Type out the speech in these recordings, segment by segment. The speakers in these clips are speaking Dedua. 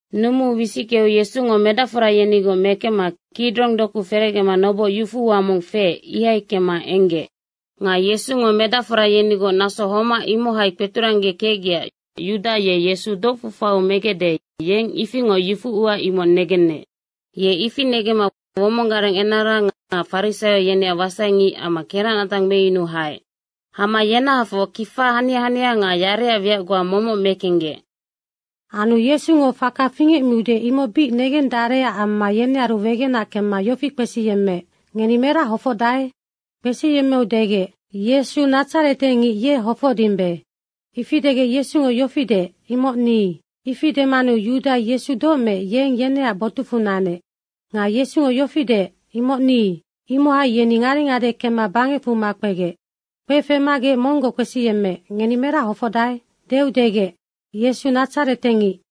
Nunumu wisickeu Yesungo medacfora yenigoc mekemma Kidrong doku ferecgema noboc yufu ua mong feec, ihai kemma enggec. Nga Yesungo medacfora yenigoc naso homac imohai kpeturanggekecgecac Yuda ye Yesu docfu faiu megecde, yeng ifingoc yufuua imoc negenec. Ye ifi negemma womong gareng enara nga farisaio yeneac wasaingic amma keracnatang meyunuu haec. Hama yenahafoc kifa hania hania nga yareac wiac goa momoc mekenggec. Anu Yesungo faka fingecmiude, imoc bic negendarecac amma yenearu wegenac kemma yofi kpesiyemmeec, “Ngeni merac hofocdae?” Kpesiyemmeu degec, “Yesu Nadzaretengic, ye hofocdimbe.” ifi degec Yesungo yofi deec, “Imoc ni.” Ifi demanu Yuda Yesu doc meec, yeng yeneac botucfu nanec. Nga Yesungo yofi deec, “Imoc ni.” imohai yeni ngade ngade kemma bangecfu makpegec. Kpefemagec monggoc kpesiyemmeec, “Ngeni merac hofocdae?” deu degec, “Yesu Nadzaretengic.”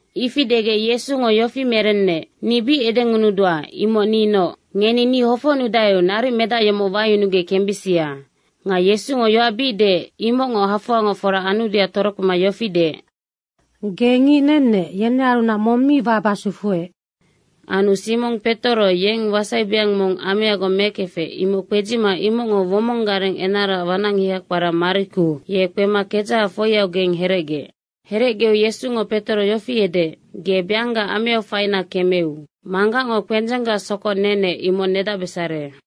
Ifi degec Yesungo yofi merenec, “Ni bic edengunudua, imoc ninoc. Ngeni ni hofocnudaeu naric medac yomoc wayunugec kembisia.” Nga Yesungo yoac bic deec, imocngo hafoangoc fora anudeac torokpema yofi deec, “Ge ngic nennec, yenearunac mong mi waba sufuec.” Anu Simong Petoro yeng wasaibeang mong ameagoc mekefec, imoc kpedzima imocngo womong gareng enaraac wanacngiha kpara Mariku, ye kpema kedzaha foiaugeng herecgeec. Herecgeu Yesungo Petoro yofi edeec, “Ge beangga ameau faina kemeu. Manggacngo kpendzenggac sokoc nenec, imoc nedacbesare.”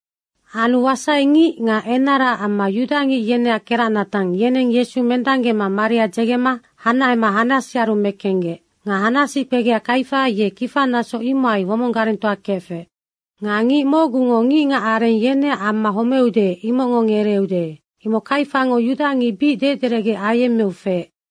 Anu wasaingic nga enara amma yudangic yeneac keracnatang yeneng Yesu mendanggema maria dzegema hanahema Hanasiaru mekenggec. Nga Hanasi kpegea Kaifa ye kifanaso imohai womong garengtoa kefec. Nga “Ngic mocgungo ngicngac areng yeneac amma homeude, imocngo ngereeude.” Imoc Kaifango yudangic bic dederecge ayemmeu feec.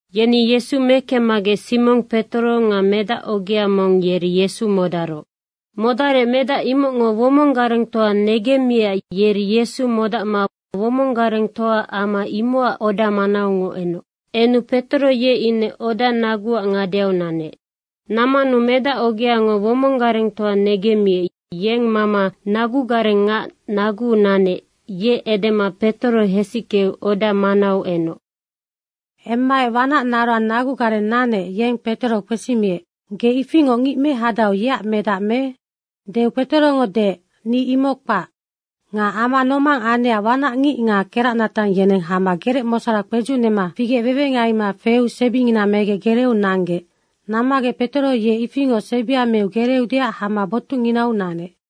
Yeni Yesu mekemmagec Simong Petoro nga medac ogea mong, yeri Yesu modaroc. Modarec medac imocngo womong garengtoa negemmiecac yeri Yesu modacma womong garenggtoaac ama imocac oda manaungoc enec. Enu Petoro ye ine oda naguac ngadeau nanec. Nammanu medac ogeango womong garengtoa negemmiec, yeng mama nagugareng ngac naguu nanec, ye edema Petoro hesickeu oda manau enoc. Emmaec wanac naroang nagugareng nanec, yeng Petoro kpesimiec, “Ge ifingoc ngic mehadau, yeac medac me?” deu Petorongo deec, “Ni imoc kpac.” Nga ama nomang anecac wanacngic nga keracnatang yeneng hama gerecmosora kpedzucnema figec wewengaima feu sebingina megec gereeu nanggec. Nammagec Petoro ye ifingoc sebia meu gereeudeac hama botucnginau nanec.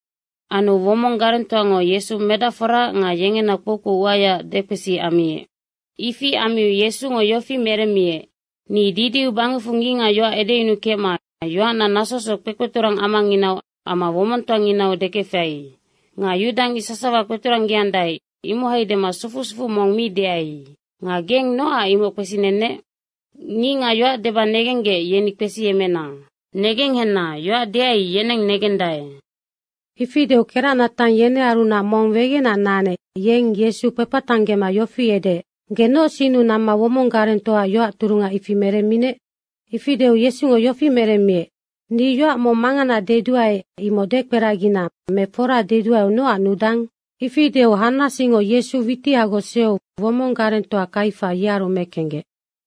Anu womong garengtoango Yesu medacforaac nga yengena kpoukpou uayaac dekpesi ammiec. Ifi ammiu Yesungo yofi meremmiec, “Ni didiu bangecfu ngicngac yoac edeyunukecma yoacna nasosoc kpekpeturang amanginau amma womongtoanginau dekefai. Nga yudangic sasawa kpeturanggeandae, imohai dema sufu sufuu mong mi deai. Nga geng nocac imoc kpesinennec? Ngicngac yoac deba negenggec, yeni kpesiyemmena. Negenghenna, yoac deai, yeneng negendae.” Ifi deu keracnatang yenearunac mong wegenac nanec, yeng Yesu kpepatanggema yofi edeec, “Ge noc sinnu namma womong garengtoaac yoac turunga ifi meremminec?” Ifi deu Yesungo yofi meremmiec, “Ni yoac mong mangana deduae, imoc dekperagina me fora deduaeu nocac nudang?” Ifi deu Hanasingo Yesu witihagoc sueu womong garengtoa Kaifa, yearu mekenggec.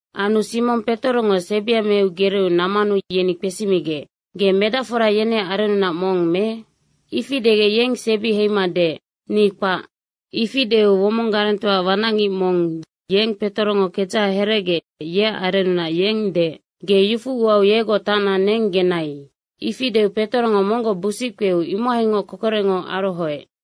Anu Simong Petorongo sebia meu gereeu nammanu yeni kpesimigec, “Ge medacfora yeneac arennunac mong me?” ifi degec, yeng sebi heima deec, “Ni kpac.” Ifi deu womong garengtoaac wanacngic mong, ye Petorongo kedzaha herecgeec, yeac arennunac, yeng deec, “Ge yufu uau yegoc tacna neng genai.” Ifi deu Petorongo monggoc busic kpeu imohaingoc kokorecngo arohoec.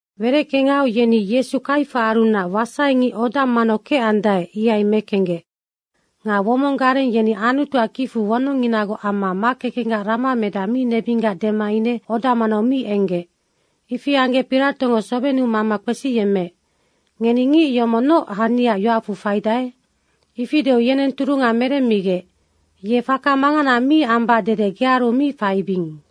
Wereckengau yeni Yesu Kaifaarunac wasaingic oda manau kecandae ihai mekenggec. Nga womong gareng yeni Anutuac kicfu wonongnginagoc amma makekenggac ramamedaha mi nebinggac dema ine oda manau mi enggec. Ifi anggec Piratongo sobennu mama kpesiyemmeec, “Ngeni ngic yomoc noc haniaac yoacfu faidae?” Ifi deu yeneng turunga meremmigec, “Ye faka mangana mi ambac dede gearu mi faibing.”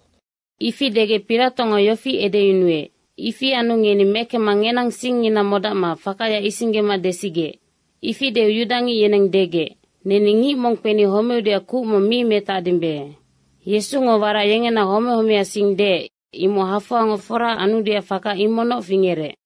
Ifi degec Piratongo yofi edeyunuec, “Ifi anu ngeni mekemma ngenang singngina modacma fakaya isinggema desigec.” Ifi deu yudangic yeneng degec, “Neni ngic mong kpeni homeudeac kuc mi metacdimbe.” Yesungo warac yengena home homeac sing deec, imoc hafoangoc fora anudeac faka imocnoc fingerec.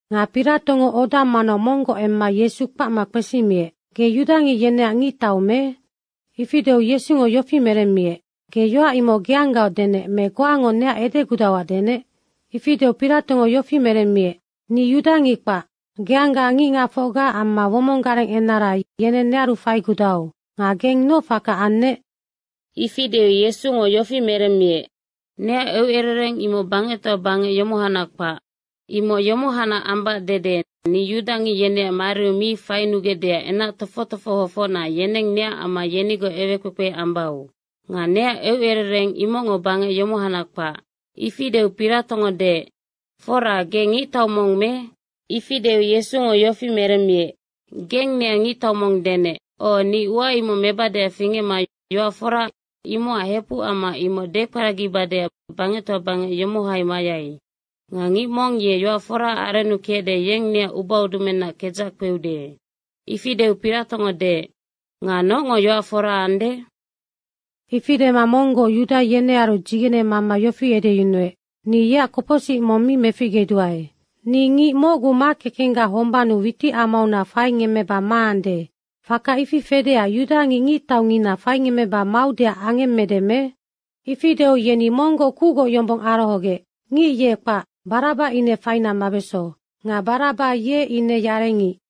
Nga Piratongo oda manau monggoc emma Yesu kpacma kpesimiec, “Ge yudangic yeneac ngictau me?” Ifi deu Yesungo yofi meremmiec, “Ge yoac imoc geanggaoc denec me goango neac edegudauac denec?” Ifi deu Piratongo yofi meremmiec, “Ni yudangic kpac. Geangga ngicngacfocga amma womong gareng enara yeneng nearu faigudau. Nga geng noc faka annec?” Ifi deu Yesungo yofi merennec, “Neac eucerereng imoc bangectoa bangec yomohacnac kpac. Imoc yomohacnac ambac dede ni yudangic yeneac mariu mi fainugecdeac enac tofoc tofohofocna yeneng neac amma yenigoc ewekpekpe ambau. Nga neac eucerereng imocngo bangec yomohacnac kpac.” Ifi deu Piratongo deec, “Fora, ge ngictau mong me?” ifi deu Yesungo yofi merenec, “Geng neac ngictau mong denec. O, ni ua imoc mebadeac fingecma yoac fora imocac hepuc amma imoc dekperagibadeac bangectoa bangec yomohai mayai. Nga ngic mong ye yoac foraac arennu kecde, yeng neac ubaudumennaac kedzac kpeude.” Ifi deu Piratongo deec, “Nga nocngo yoac fora ande?” Ifi dema monggoc Yuda yenearu dzigene mama yofi edeyunuec, “Ni yeac kopocsic mong mi meficgeduae. Ni ngic mocgu makekenggac hombannu witicamaunac faingemmeba maande, faka ifi fedeac yudangic ngictaungina faingemmeba maudeac angemmede me?” Ifi deu yeni monggoc kucgoc yombong arohogec, “Ngic ye kpac, Baraba ine faina mabeso.” Nga Baraba ye ine yarengic.